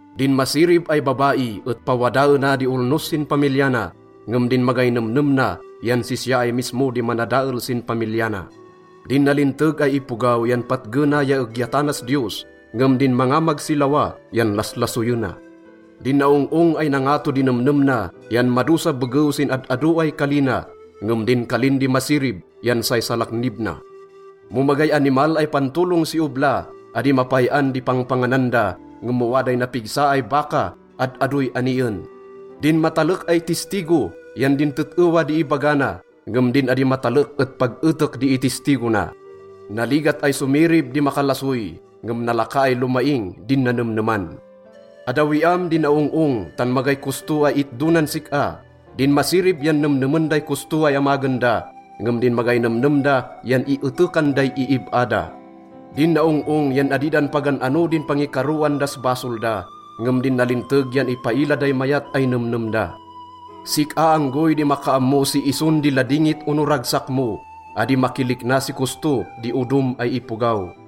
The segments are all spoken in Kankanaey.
Din masirib ay babai et pawadaena di olnos sin pamilya na, ngem din magay nemnem na yan sisya ay mismo di manadael sin pamilya na. Din nalinteg ay ipogaw yan patgena ya egyatanas Diyos, ngem din mangamag si lawa yan laslasoyena. Din naong-ong ay nangato di nemnem na yan madosa begew sin ad-ado ay kali na, ngem din kalin di masirib yan say salaknib na. Mo magay animal ay pantolong si obla, adi mapay-an di pangpanganan da, ngem mo waday napigsa ay baka, ad-adoy anien. Din matalek ay tistigo yan din tet-ewa di ibaga na, ngem din adi matalek et pag etek di itistigo na. Naligat ay somirib di makalasoy, ngem nalaka ay lomaing din nanemneman. Addawiam di naong-ong, tan magay kosto ay itdo nan sik-a. Din masirib yan nemnemen day kosto ay amagen da, ngem din magay nemnem da yan ietekan day iib-a da. Din naong-ong yan adi dan pagan-ano din pangikaroan das basol da, ngem din nalinteg yan ipaila day mayat ay nemnem da. Sik-a anggoy di makaammo si ison di ladingit ono ragsak mo. Adi makilikna si kosto di odom ay ipogaw.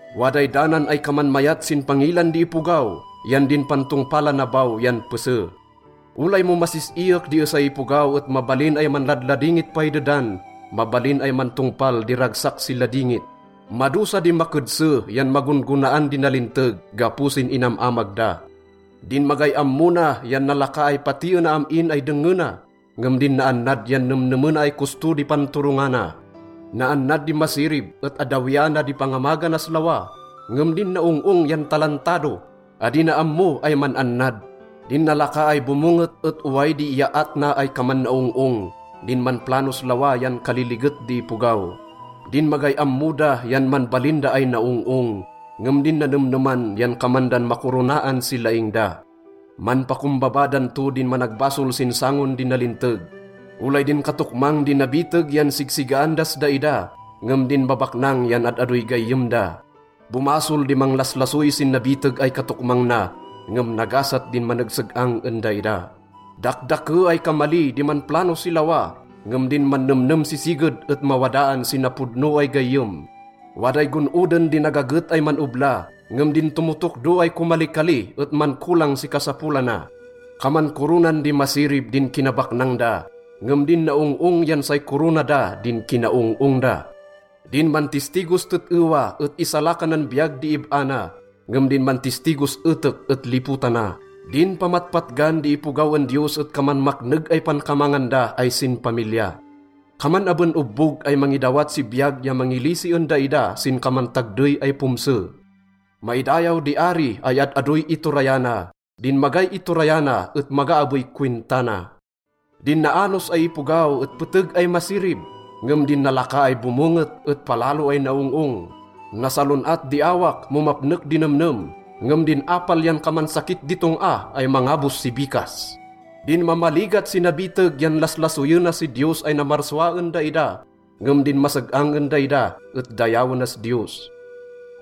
Waday danan ay kaman mayat sin pangilan di ipogaw, yan din pantongpalana baw yan pese. Olay mo masis-iyek di esay ipogaw et mabalin ay manladladingit pay dedan. Mabalin ay mantongpal di ragsak si ladingit. Madosa di makedse yan magon-gonaan di nalinteg gapo sin inam-amag da. Din magay ammo na yan nalaka ay patiena am-in ay dengngena, ngem din naannad yan nemnemena ay kosto di panturongana. Naannad di masirib et addawiana di pangamaganas lawa, ngem din naong-ong yan talantado, adi na ammo ay man-annad. Din nalaka ay bomonget et oway di iyaat na ay kaman naong-ong. Din manplanos lawa yan kaliliget di ipogaw. Din magay ammo da yan manbalin da ay naong-ong, ngem din nanemneman yan kaman dan makoronaan si laing da. Manpakombaba dan to din managbasol sin sangon di nalinteg. Olay din katokmang di nabiteg yan sigsigaan das daida, ngem din babaknang yan ad-adoy gayyem da. Bomasol di manglaslasoy sin nabiteg ay katokmang na, ngem nagasat din manegseg-ang en daida. Dakdake ay kamali di manplano si lawa, ngem din mannemnem si siged et mawadaan si napodno ay gayyem. Waday gon-oden di nagaget ay man-obla, ngem din tomotokdo ay komalikali et mankolang si kasapolana. Kaman koronan di masirib din kinabaknang da, ngem din naong-ong yan say korona da din kinaong-ong da. Din mantistigos tet-ewa et isalakanan biyag di ib-a na, ngem din mantistigos etek et lipotana. Din pamatpatgan di ipogaw en Diyos et kaman makneg ay pankamangan da ay sinpamilya. Kaman aben obbog ay mangidawat si biyag ya mangilisi en daida sin kaman tagdey ay pomse. Maidayaw di ari ay ad-adoy iturayana. Din magay iturayana et maga abey kowinta na. Din naanos ay ipogaw et peteg ay masirib, ngem din nalaka ay bomonget et palalo ay naong-ong. Nasalon-at di awak mo mapnek di nemnem, ngem din apal yan kaman sakit di tong-a ay mangabos si bikas. Din mamaligat si nabiteg yan laslasoyena si Diyos ay namarsua en daida, ngem din maseg-ang en daida et dayawenas Diyos.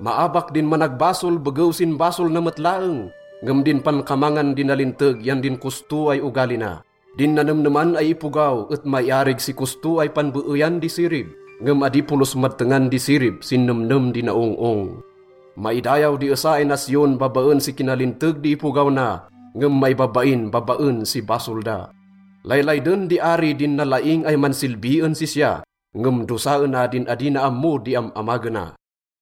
Maabak din managbasol begew sin basol na met laeng, ngem din pankamangan di nalinteg yan din kosto ay ogali na. Din nanemneman ay ipogaw et maiarig si kosto ay panbeeyan di sirib, ngem adi polos madtengan di sirib sin nemnem di naong-ong. Maidayaw di esa ay nasyon babaen si kinalinteg di ipogaw na, ngem maibabain babaen si basol da. Laylayden di ari din nalaing ay mansilbi en sisya, ngem dosaena din adi na ammo di am-amagena.